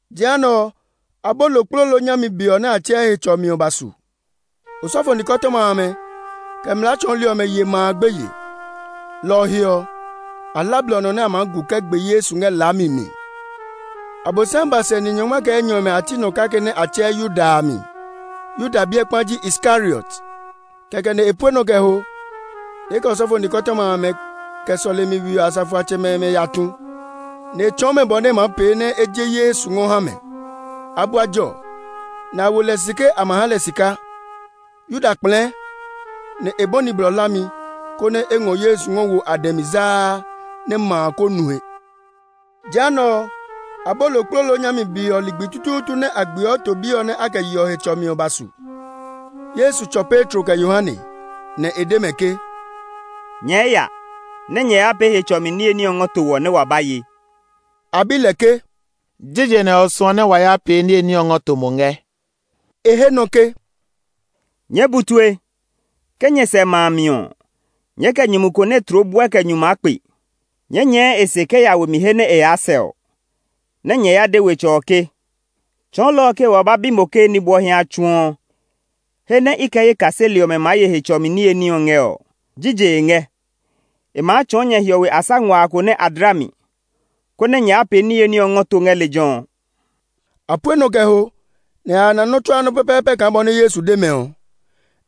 Jehanɛ ɔ, Abolokplolo nyami be ɔ nɛ a tsɛɛ Hetsɔmi ɔ ba su. Osɔfo nikɔtɔma amɛ, kɛ mlaa tsɔɔli ɔmɛ ye ma a gbeye; lɔ ɔ he ɔ, a hla blɔ nɔ nɛ a maa gu kɛ gbe Yesu ngɛ laami mi. Abosiami ba sɛ ni nyɔngma kɛ enyɔ ɔmɛ a ti nɔ kake nɛ a tsɛɛ Yuda a mi. Yuda biɛ kpa ji Iskariot. Kɛkɛ nɛ e pue nɔ kɛ ho, nɛ e kɛ osɔfo nikɔtɔma amɛ, kɛ sɔlemi we ɔ asafoatsɛmɛ ɔmɛ ya sɛɛ ní, nɛ e tsɔɔ mɛ bɔ nɛ e maa pee nɛ e je Yesu ngɔ ha mɛ. A bua jɔ, nɛ a wo lɛ si ke a ma ha lɛ sika. Yuda kplɛɛ, nɛ e bɔni blɔ hlami, konɛ e ngɔ Yesu ngɔ wo a dɛ mi zaa nɛ ma a kó nu he. Jehanɛ ɔ, Abolokplolo nyami be ɔ ligbi tutuutu nɛ a gbeɔ to bi ɔ nɛ a kɛ yeɔ Hetsɔmi ɔ ba su. Yesu tsɔ Petro kɛ Yohane, nɛ e de mɛ ke, “Nyɛɛ ya nɛ nyɛ ya pee Hetsɔmi niye ní ɔ ngɔ to wɔ nɛ wa ba ye.” A bi lɛ ke, “Jije nɛ o suɔ nɛ wa ya pee niye ní ɔ ngɔ to mo ngɛ?” E he nɔ ke, “Nyɛɛ bu tue! Ke nyɛ sɛ ma a mi ɔ, nyɛɛ kɛ nyumu ko nɛ tloo buɛ kɛ nyu maa kpe. Nyɛɛ nyɛɛ e se kɛ ya we mi he nɛ e yaa sɛ ɔ, nɛ nyɛ ya de wetsɛ ɔ ke, ‘Tsɔɔlɔ ɔ ke wa ba bi mo ke nibwɔhi a tsu ɔ, he nɛ i kɛ ye kaseli ɔmɛ maa ye Hetsɔmi niye ní ɔ ngɛ ɔ, jije e ngɛ?’ E maa tsɔɔ nyɛ hiɔwe asa nguaa ko nɛ a dla mi, konɛ nyɛ ya pee niye ní ɔ ngɔ to ngɛ lejɛ ɔ.” A pue nɔ kɛ ho, nɛ a ya na nɔ́ tsuaa nɔ́ pɛpɛɛpɛ kaa bɔ nɛ Yesu de mɛ ɔ.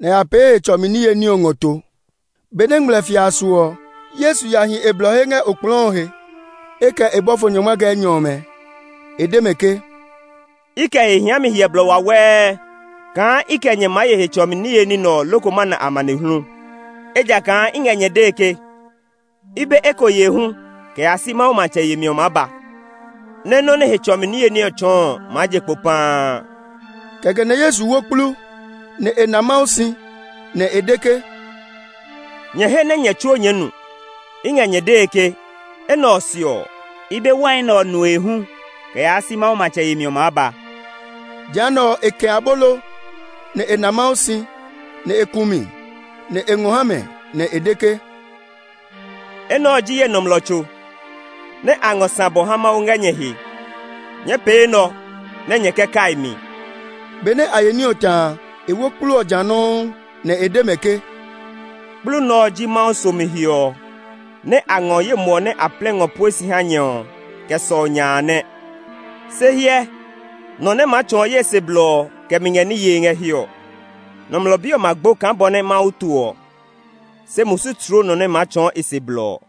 Nɛ a ya pee Hetsɔmi niye ní ɔ ngɔ to. Benɛ ngmlɛfia a su ɔ, Yesu ya hi e blɔ he ngɛ okplɔɔ ɔ he; e kɛ bɔfo nyɔngma kɛ enyɔ ɔmɛ. E de mɛ ke, “I kɛ he hiami hyɛ blɔ wawɛɛ kaa i kɛ nyɛ maa ye Hetsɔmi niye ní nɛ ɔ loko ma na amanehlu! Ejakaa i ngɛ nyɛ dee ke, i be eko yee hu kɛ yaa si Mawu matsɛ yemi ɔ maa ba, nɛ́ nɔ nɛ Hetsɔmi niye ní ɔ tsɔɔ ɔ maa je kpo paa.” Kɛkɛ nɛ Yesu wo kplu, nɛ e na Mawu si, nɛ e de ke, “Nyɛ he nɛ nyɛ tsuo nyɛɛ nu. I ngɛ nyɛ dee ke, enɛ ɔ se ɔ, i be wai nɛ ɔ nue hu kɛ yaa si Mawu matsɛ yemi ɔ maa ba.” Jehanɛ ɔ, e kɛ̃ abolo, nɛ e na Mawu si, nɛ e ku mi, nɛ e ngɔ ha mɛ, nɛ e de ke, “Enɛ ɔ ji ye nɔmlɔ tso [nɛ a ngɔ sã bɔ ha Mawu ngɛ nyɛ he. Nyɛɛ pee enɛ ɔ nɛ nyɛ kɛ kai mi.” Benɛ a ye ní ɔ ta a, e wo kplu ɔ ja nɔuu, nɛ e de mɛ ke, “Kplu nɛ ɔ ji Mawu somi he ɔ nɛ a ngɔ ye muɔ nɛ a plɛ ngɔ pue si ha nyɛ ɔ kɛ sɔu nya a nɛ.] “Se hyɛ! Nɔ nɛ maa tsɔɔ ye se blɔ ɔ kɛ mi ngɛ ní yee ngɛ hiɛ ɔ! Nɔmlɔ Bi ɔ ma gbo kaa bɔ nɛ Mawu to ɔ, se musu tloo nɔ nɛ maa tsɔɔ e se blɔ ɔ!”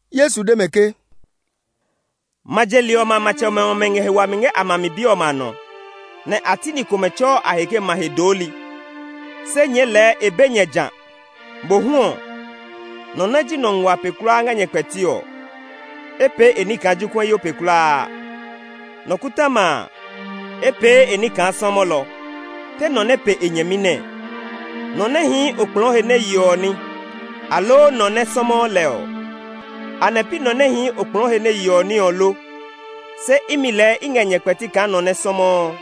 Yesu de mɛ ke, “Ma je li ɔmɛ a matsɛmɛ ɔmɛ ngɛ he wami ngɛ a ma mi bi ɔmɛ a nɔ, nɛ a ti ni komɛ tsɛɔ a he ke ‘Ma he dooli.’ Se nyɛɛ lɛɛ e be nyɛ jã. Mohu ɔ, nɔ nɛ ji nɔ nguaa pe kulaa ngɛ nyɛ kpɛti ɔ, e pee e ní kaa jokuɛyo pe kulaa; nɔkɔtɔma a, e pee e ní kaa sɔmɔlɔ. Te nɔ nɛ pe e nyɛmi nɛɛ: nɔ nɛ hii okplɔɔ he nɛ yeɔ ní, aloo nɔ nɛ sɔmɔɔ lɛ? Anɛ pi nɔ nɛ hii okplɔɔ he nɛ yeɔ ní ɔ lo? Se imi lɛɛ i ngɛ nyɛ kpɛti kaa nɔ nɛ sɔmɔɔ.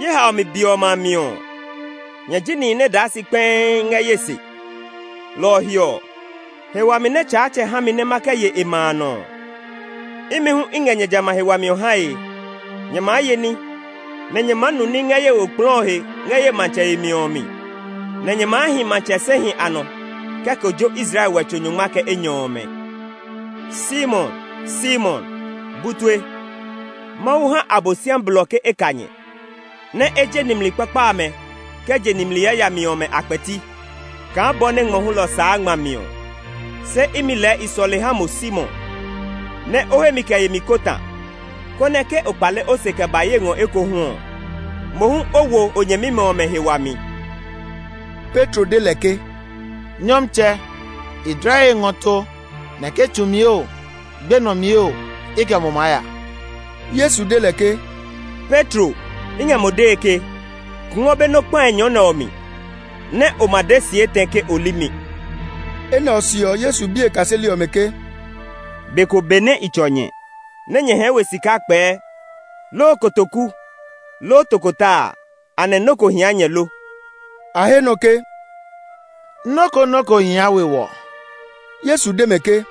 “Ye haomi be ɔmɛ a mi ɔ, nyɛ ji nihi nɛ daa si kpɛii ngɛ ye se. Lɔ ɔ he ɔ, he wami nɛ Tsaatsɛ ha mi nɛ ma kɛ ye e ma a nɔ ɔ, imi hu i ngɛ nyɛ jamɛ a he wami ɔ hae. Nyɛ maa ye ní, nɛ nyɛ maa nu ní ngɛ ye we okplɔɔ ɔ he ngɛ ye matsɛ yemi ɔ mi; nɛ nyɛ maa hi matsɛ sɛhi a nɔ kɛ kojo Israel wɛtso nyɔngma kɛ enyɔ ɔmɛ. “Simon, Simon! Bu tue! Mawu ha Abosiami blɔ ke e ka nyɛ, nɛ e je nimli kpakpa amɛ kɛ je nimli yayami ɔmɛ a kpɛti kaa bɔ nɛ ngmɔ hulɔ saa ngma mi ɔ. Se imi lɛɛ i sɔle ha mo Simon, nɛ o hemi kɛ yemi kó ta, konɛ ke o kpale o se kɛ ba ye ngɔ ekohu ɔ, mo hu o wo o nyɛmimɛ ɔmɛ he wami.” Petro de lɛ ke, “Nyɔmtsɛ, i dla ye he ngɔ to nɛ ke tsu mi oo, gbenɔ mi oo, i kɛ mo maa ya!” Yesu de lɛ ke, “Petro, i ngɛ mo dee ke, kungwɔ be nɔ́ kpae nyɔ nɛ ɔ mi, nɛ o ma de si etɛ ke o li mi.” Enɛ ɔ se ɔ, Yesu bi e kaseli ɔmɛ ke, “Be ko benɛ i tsɔ nyɛ, nɛ nyɛɛ hɛɛ we sika kpɛɛ, loo kotoku, loo tokota a, anɛ nɔ́ ko hia nyɛ lo?” A he nɔ ke, “Nɔ́ ko nɔ́ ko hia we wɔ.” Yesu de mɛ ke,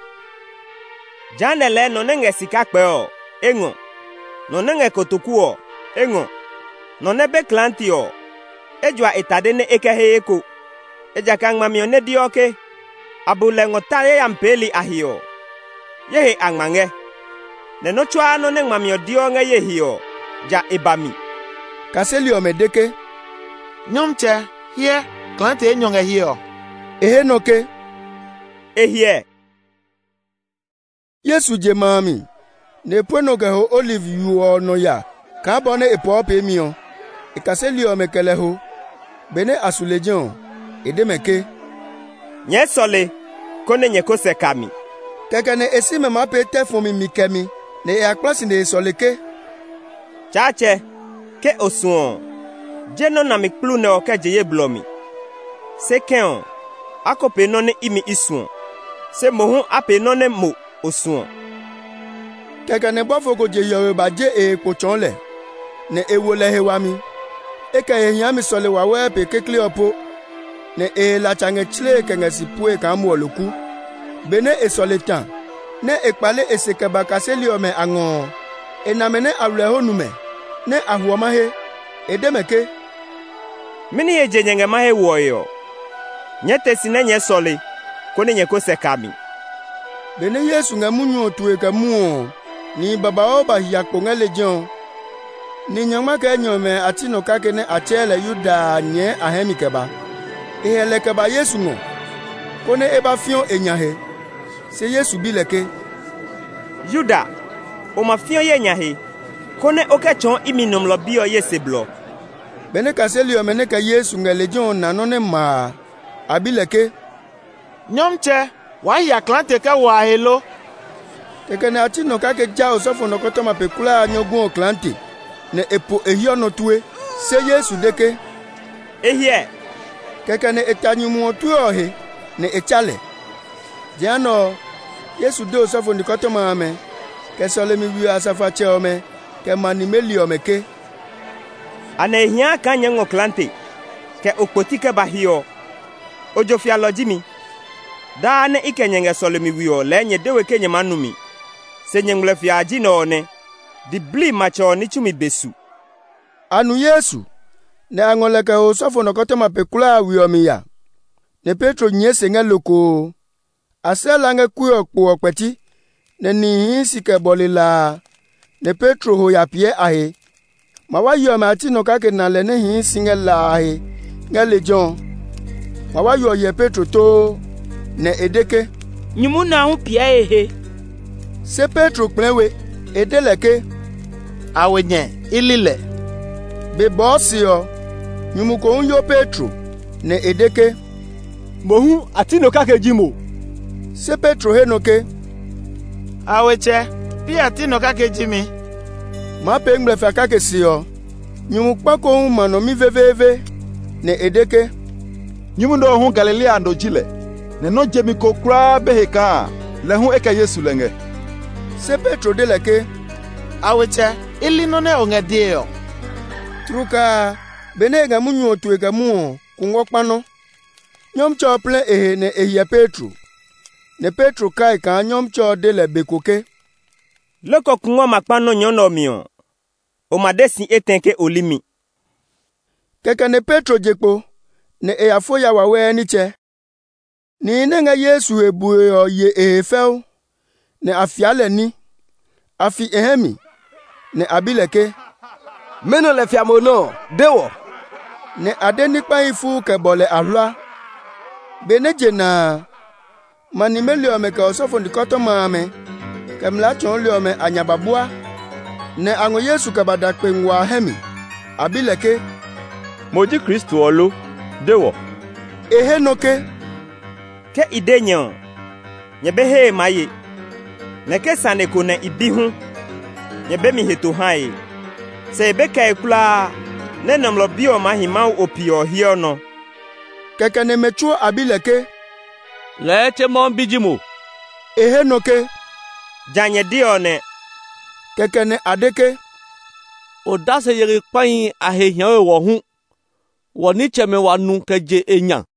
“Jehanɛ ɔ lɛɛ nɔ nɛ ngɛɛ sika kpɛ ɔ, e ngɔ; nɔ nɛ ngɛ kotoku ɔ, e ngɔ; nɔ nɛ be klaate ɔ, e jua e tade, nɛ e kɛ he eko. Ejakaa ngmami ɔ nɛ deɔ ke, ‘A bu lɛ ngɔ ta yayami peeli a he’ ɔ, ye he a ngma ngɛ. Nɛ nɔ́ tsuaa nɔ́ nɛ ngmami ɔ deɔ ngɛ ye he ɔ, ja e ba mi.” Kaseli ɔmɛ de ke, “Nyɔmtsɛ, hyɛ! Klaate enyɔ ngɛ hiɛ ɔ!” E he nɔ ke, “E hiɛ!” Yesu je ma a mi, nɛ e pue nɔ kɛ ho Oliv yo ɔ nɔ ya kaa bɔ nɛ e pɔɔ peemi ɔ. E kaseli ɔmɛ kɛ lɛ ho. Benɛ a su lejɛ ɔ, e de mɛ ke, “Nyɛɛ sɔle, konɛ nyɛ ko sɛ ka mi.” Kɛkɛ nɛ e si mɛ maa pee tɛ fɔmi mi kɛmi, nɛ e ya kpla si, nɛ e sɔle ke, “Tsaatsɛ, ke o suɔ ɔ, je nɔ́ nami kplu nɛ ɔ kɛ je ye blɔ mi. Se kɛ̃ ɔ, a ko pee nɔ́ nɛ imi i suɔ; se mohu a pee nɔ́ nɛ mo o suɔ.” [ Kɛkɛ nɛ bɔfo ko je hiɔwe ba je e he kpo tsɔɔ lɛ, nɛ e wo lɛ he wami. E kɛ he hiami sɔle wawɛɛ pe kekle ɔ po, nɛ e he latsa ngɛ tslee kɛ ngɛ si puee kaa muɔloku.] Benɛ e sɔle ta, nɛ e kpale e se kɛ ba kaseli ɔmɛ a ngɔ ɔ, e na mɛ nɛ aywilɛho nu mɛ, nɛ a hwɔ mahe. E de mɛ ke, “Mɛni he je nyɛ ngɛ mahe hwɔe ɔ? Nyɛɛ te si nɛ nyɛɛ sɔle, konɛ nyɛ ko sɛ ka mi.” Benɛ Yesu ngɛ munyu ɔ tue kɛ mwɔɔ ɔ, nihi babauu ba hia kpo ngɛ lejɛ ɔ. Ni nyɔngma kɛ enyɔ ɔmɛ a ti nɔ kake nɛ a tsɛɛ lɛ Yuda a nyɛɛ a hɛ mi kɛ ba. E hɛ lɛ kɛ ba Yesu ngɔ, konɛ e ba fiɔ e nya he. Se Yesu bi lɛ ke, “Yuda, o ma fiɔ ye nya he, konɛ o kɛ tsɔɔ imi Nɔmlɔ Bi ɔ, ye se blɔ?” Benɛ kaseli ɔmɛ nɛ kɛ Yesu ngɛ lejɛ ɔ na nɔ́ nɛ ma a, a bi lɛ ke, “Nyɔmtsɛ, waa hia klaate kɛ wo a he lo?” Kɛkɛ nɛ a ti nɔ kake ja osɔfo nɔkɔtɔma pe kulaa a nyɔguɛ klaate, nɛ e po e hiɔ nɔ tue. Se Yesu de ke, “E hiɛ!” Kɛkɛ nɛ e ta nyumu ɔ tue ɔ he, nɛ e tsa lɛ. Jehanɛ ɔ, Yesu de osɔfo nikɔtɔma amɛ, kɛ sɔlemi we ɔ asafoatsɛmɛ ɔmɛ, kɛ ma nimeli ɔmɛ ke, “Anɛ e hia kaa nyɛɛ ngɔ klaate, kɛ okpoti kɛ ba hiɛ ɔ? Ojo fialɔ ji mi? Daa nɛ i kɛ nyɛ ngɛ sɔlemi we ɔ lɛɛ nyɛ de we ke nyɛ maa nu mi. Se nyɛ ngmlɛfia a ji nɛ ɔ nɛ; diblii matsɛ ɔ ní tsumi be su!” A nu Yesu, nɛ a ngɔ lɛ kɛ ho osɔfo nɔkɔtɔma pe kulaa a we mi ya; nɛ Petro nyɛɛ se ngɛ lokoo. A slɛ la ngɛ kue ɔ kpɛti, nɛ nihi hii si kɛ bɔle la a, nɛ Petro ho ya piɛ a he. Mawayi ɔmɛ a ti nɔ kake na lɛ nɛ hii si ngɛ la a he ngɛ lejɛ ɔ. Mawayo ɔ hyɛ Petro too, nɛ e de ke, “Nyumu nɛ ɔ hu piɛ e he!” Se Petro kplɛɛ we. E de lɛ ke, “Awenyɛ, i li lɛ!” Be bɔɔ se ɔ, nyumu ko hu yo Petro, nɛ e de ke, “Mo hu a ti nɔ kake ji mo!” Se Petro he nɔ ke, “Awetsɛ, pi a ti nɔ kake ji mi!” Maa pee ngmlɛfia kake se ɔ, nyumu kpa ko hu ma nɔ mi veveeve, nɛ e de ke, “Nyumu nɛ ɔ hu Galilea no ji lɛ, nɛ nɔ́ jemi ko kulaa be he kaa lɛ hu e kɛ Yesu lɛ ngɛ!” Se Petro de lɛ ke, “Awetsɛ, i li nɔ́ nɛ o ngɛ dee ɔ!” Tlukaa a, benɛ e ngɛ munyu ɔ tue kɛ mwɔɔ ɔ, kungwɔ kpa nɔ. Nyɔmtsɛ ɔ plɛ e he nɛ e hyɛ Petro. Nɛ Petro kai kaa Nyɔmtsɛ ɔ de lɛ be ko ke, “Loko kungwɔ ma kpa nɔ nyɔ nɛ ɔ mi ɔ, o ma de si etɛ ke o li mi.” Kɛkɛ nɛ Petro je kpo, nɛ e ya fo ya wawɛɛ nitsɛ. Nihi nɛ ngɛ Yesu he bue ɔ ye e he fɛu, nɛ a fia lɛ ní. A fi e hɛ mi, nɛ a bi lɛ ke, “Mɛnɔ lɛ fia mo nɔ́ ɔ? De wɔ!” Nɛ a de ní kpahi fuu kɛ bɔ lɛ ahlua. Benɛ je na a, ma nimeli ɔmɛ, kɛ osɔfo nikɔtɔma amɛ, kɛ mlaa tsɔɔli ɔmɛ a nya ba bua, nɛ a ngɔ Yesu kɛ ba da kpe nguaa a hɛ mi. A bi lɛ ke, “Mo ji Kristo ɔ lo? De wɔ!” E he nɔ ke, “Ke i de nyɛ ɔ, nyɛ be hee maa ye, nɛ ke sane ko nɛ i bi hu, nyɛ be mi heto hae. Se e be kɛe kulaa nɛ Nɔmlɔ Bi ɔ maa hi Mawu Ope ɔ hiɔ nɔ.” Kɛkɛ nɛ mɛ tsuo a bi lɛ ke, “Lɛɛ tse Mawu bi ji mo?” E he nɔ ke, “Ja nyɛ de ɔ nɛ.” Kɛkɛ nɛ a de ke, “Odase yeli kpahi a he hia we wɔ hu! Wɔ nitsɛmɛ wa nu kɛ je e nya!”